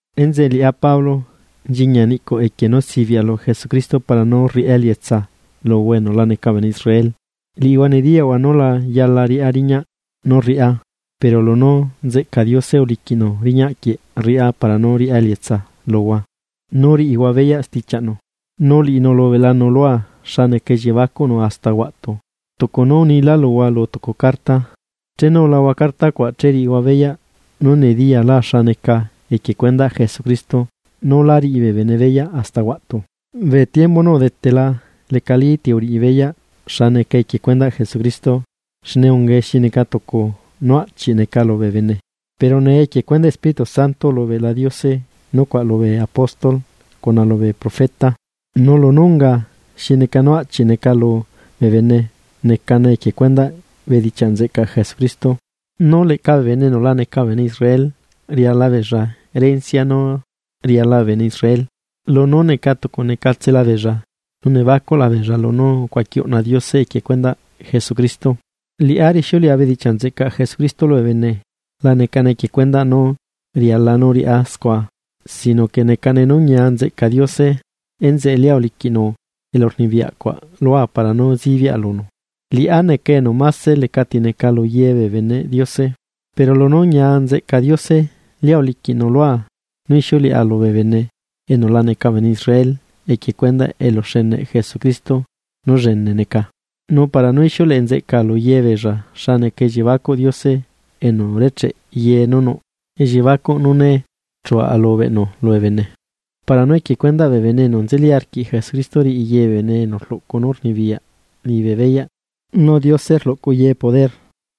Enzeꞌe liꞌá Pablo, nchiñia niꞌcuꞌ equie nú sibiꞌa lu Jesucristo para nú rriꞌá elietsa luhua enu laca bee bene Israel. Liꞌihua nediyaꞌhua nú la yala riꞌá riñaꞌ nú rriꞌá, pero lunú nzeꞌca Diose uliquiꞌnu riñaꞌ quieꞌ rriꞌá para nú riꞌá elietsa luhua nú riꞌihua beyaꞌ stichiaꞌnu. Nu liꞌinu ulubeꞌlanu lua xa neca elliebacuꞌnu hasta huaꞌtu, tucu nú unilá luhua lu tucu carta. Chenu ulahua carta cuaꞌ che riꞌihua beyaꞌ nú nediyala xa neca equie cuendaꞌ Jesucristo nú la riꞌi bee bene beyaꞌ hasta huaꞌtu. Bee tiembu nú udetela lecali ti uriꞌi beyaꞌ xa neca equie cuendaꞌ Jesucristo, xne ungae xi neca tucu nú aꞌchiꞌ neca lubee bene, pero nee equie cuendaꞌ Espíritu Santo ulubeꞌla Diose nucuaꞌ lubee apóstol cuna lubee profeta. Nu lunú unga xi neca nú aꞌchiꞌ neca lubee bene, necane equie cuendaꞌ bedichiaꞌ nzeꞌcaꞌ Jesucristo, nú leꞌca bee bene enu laca bee bene Israel riala beella erencia nú riala bee bene Israel lunú neca tucunecatsela beella, nu nebacuꞌla beella lunú ucuaqui uꞌna Diose equie cuendaꞌ Jesucristo. Liꞌá rixiuleꞌa bedichiaꞌ nzeꞌcaꞌ Jesucristo lubee bene, la necane equie cuendaꞌ nú riala nú riꞌá scua sino que necane nú ñia nzeꞌca Diose enzeꞌe lia uliquiꞌnu elurnibiyaꞌcuaꞌ lua para nú zibiꞌa lunu. Liꞌá neca enu máse leca tineca lu ye bee beneꞌ Diose, pero lunú ñia nzeꞌca Diose lia uliquiꞌnu lua nú ixiuleꞌa lubee bene enu la neca bee bene Israel equie cuendaꞌ eluxeneꞌ Jesucristo nú llene neca. Nu para nú ixiuleꞌe nzeꞌcaa lu yebeella xa neca elliebacuꞌ Diose enu urecheꞌ ye nú nuꞌ, elliebacuꞌ nú né chu alubeꞌnu lubee bene. Para nú equie cuendaꞌ bee bene enu nzeli arquiꞌ Jesucristo riꞌi ye bee enu rluꞌcu nú rnibiyaꞌ liñibe beyaꞌ nú Diose rluꞌcu ye poder.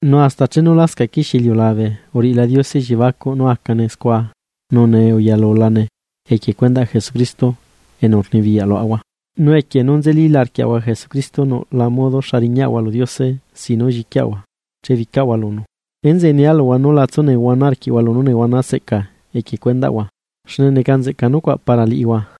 Nu hasta chenu lascaꞌ quixie iliulabe uriꞌila Diose elliebacuꞌ nú acane scua nu nee uyalulane equie cuendaꞌ Jesucristo enu rnibiyaꞌ luaꞌahua. Nu equie nú nzelila arquiaꞌahua Jesucristo nuꞌla modo xa riñaꞌahua lu Diose sin nú lliquiaꞌahua chebicaꞌahua lunu. Enzeꞌe nia luhua nú la tsunehuana arquiꞌhua lunú nehuana seꞌcaa equie cuendaꞌhua, xne neca nzeꞌca nucuaꞌ para liꞌihua.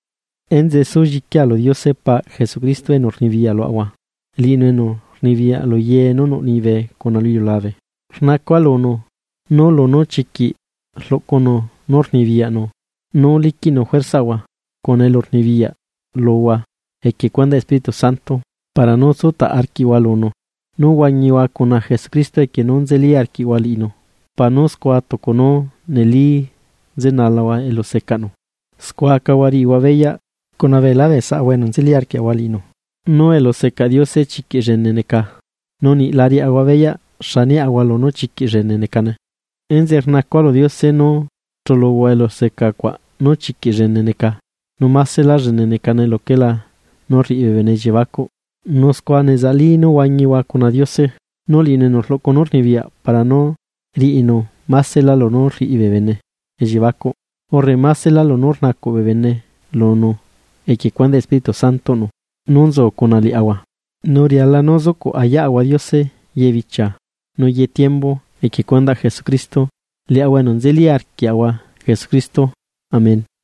Enzeꞌe súlliquia lu Diose paꞌ Jesucristo enu rnibiyaꞌ luaꞌahua, liꞌinu enu rnibiyaꞌ lu ye nú nuꞌ liñibe cuna lu iliulabe. Rnacua lunu, nú lunú chiquiꞌ rluꞌcunu poder nú liquiꞌnu juerzaꞌahua cuna elurnibiyaꞌ luhua equie cuendaꞌ Espíritu Santo para nú tsutaꞌ arquiꞌhua lunu, nu huañihua cuna Jesucristo equie nú nzeli arquiꞌhua liꞌinu para nú scua tucu nú neli nzenalahua elusecaꞌnu. Scua acahua riꞌihua beyaꞌ cuna beelá bee saꞌhua enu nzeli arquiaꞌahua liꞌinu nú eluseca Diose chiquiꞌ llene neca, nu niꞌ la riaꞌahua beyaꞌ xa niaꞌahua lunú chiquiꞌ llene necane. Enzeꞌe rnacua lu Diose nú chuluhua eluseca cuaꞌ nú chiquiꞌ llene neca, nu másela llene necane luquelá nú rriꞌi bee bene elliebacuꞌ, nu scua nezaꞌli nú huañihua cuna Diose. Nu liꞌinu enu rluꞌcu nú rnibiyaꞌ para nú riꞌinu másela lunú rriꞌi bee bene elliebacuꞌ, urre másela lunú rnacuꞌ bee bene lunu equie cuendaꞌ Espíritu Santoꞌnu nú nzu cuna liaꞌahua. Nu riala nú zucuꞌ uyaꞌahua Diose ye bichia nu ye tiembu equie cuendaꞌ Jesucristo, liaꞌahua enu nzeli arquiaꞌahua Jesucristo. Amén.